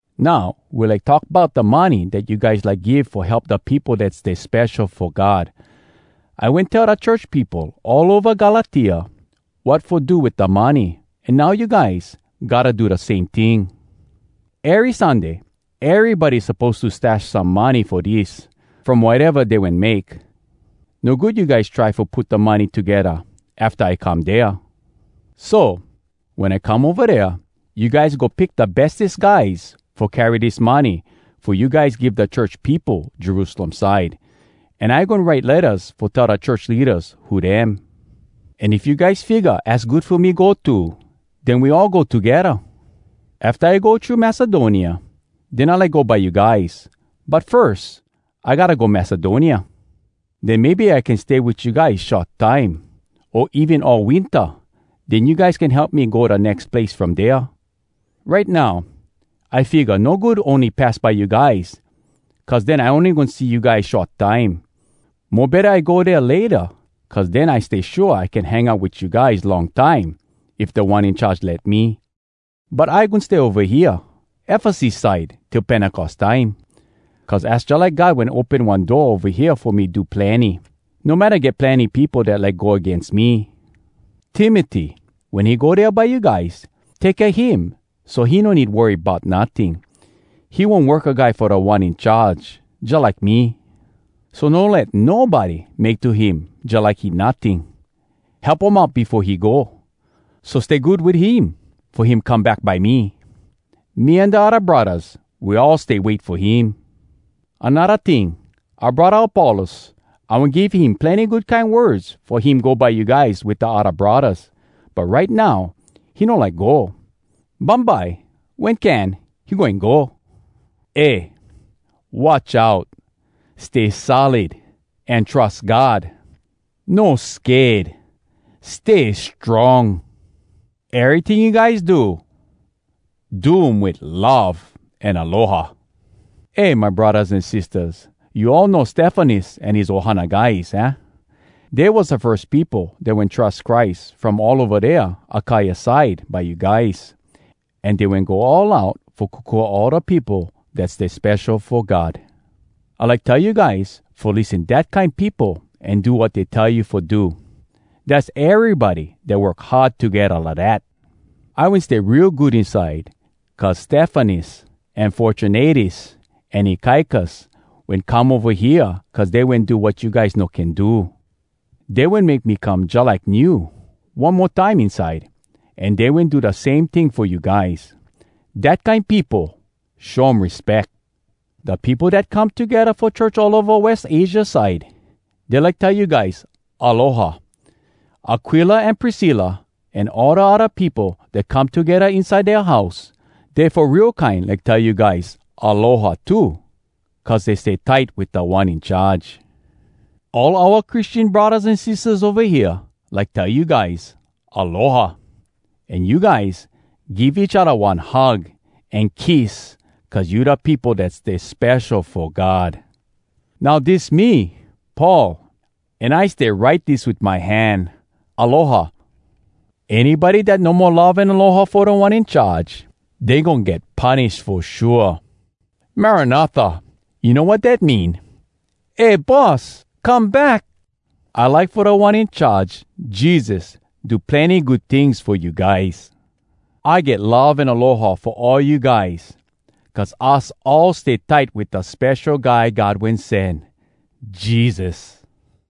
Now we like talk bout da money dat you guys like give fo help da peopo dat stay spesho fo God. I wen tell da church peopo all ova Galatia, wat fo do wit da money, an now you guys, gotta do da same ting. Ery Sunday, erybody suppose to stash some money fo dis, from wateva dey wen make. No good you guys try fo put da money togedda afta I come dea. So, wen I come ova dea, you guys go pick da bestes guys fo carry dis money fo you guys give da church peopo Jerusalem side, an I goin write lettas fo tell da church leadas who dem. An if you guys figga az good fo me go too, den we all go togedda. Afta I go thru Macedonia, den I like go by you guys. But firs, I gotta go Macedonia. Den maybe I can stay wit you guys short time, o even all winta. Den you guys can help me go da nex place from dea. Right now, I figga no good ony pass by you guys cuz den I ony goin see you guys short time. Mo betta I go dea layta cuz den I stay shua I can hang out wit you guys long time if Da One In Charge let me. But I goin stay ova hea Efesus side till Pentecos time. Cuz az jalike God wen open one door ova hea fo me do plenny, no matta get plenny peopo dat like go agains me. Timoty, wen he go dea by you guys, take kea him so he no need worry bout notting. He one worka guy fo Da One In Charge, jalike me. So no let nobody make to him jalike he notting. Help um out befo he go. So stay good wit him, fo him come back by me. Me an da odda braddahs, we all stay wait fo him. Anodda ting, oua braddah Apollos, I wen give him plenny good kine words fo him go by you guys wit da odda braddahs. But right now, he no like go. Bumbye wen can, he goin go. Eh! Watch out! Stay solid an trus God! No sked! Stay strong! Eryting you guys do, do um wit love an aloha. Eh, my braddahs an sistahs, you all know Stefanas an his ohana guys, aah? Dey was da firs peopo dat wen trus Christ from all ova dea Akaia side by you guys. An dey wen go all out fo kokua all da peopo dat stay spesho fo God. I like tell you guys fo lissen dat kine peopo an do wat dey tell you fo do. Dass erybody dat work hard togedda lidat. I wen stay real good inside cuz Stefanas, an Fortunatus, an Akaicus wen come ova hea cuz dey wen do wat you guys no can do. Dey wen make me come jalike new one mo time inside, an dey wen do da same ting fo you guys. Dat kine peopo, show um respeck. Da peopo dat come togedda fo church all ova West Asia side, dey like tell you guys “Aloha!” Aquila an Priscilla, an all da odda peopo dat come togedda inside dea house, dey fo real kine like tell you guys “Aloha!” too cuz dey stay tight wit Da One In Charge. All oua Christian braddahs an sistahs ova hea like tell you guys “Aloha!” An you guys, give each odda one hug an kiss cuz you da peopo dat stay spesho fo God. Now dis me, Paul, an I stay write dis wit my hand: Aloha! Anybody dat no mo love an aloha fo Da One In Charge, dey goin get punish fo shua! “Marana Tha!” You know wat dat mean? “Eh, Boss! Come back!” I like fo Da One In Charge, Jesus, do plenny good tings fo you guys. I get love an aloha fo all you guys cuz us all stay tight wit da Spesho Guy God Wen Sen, Jesus!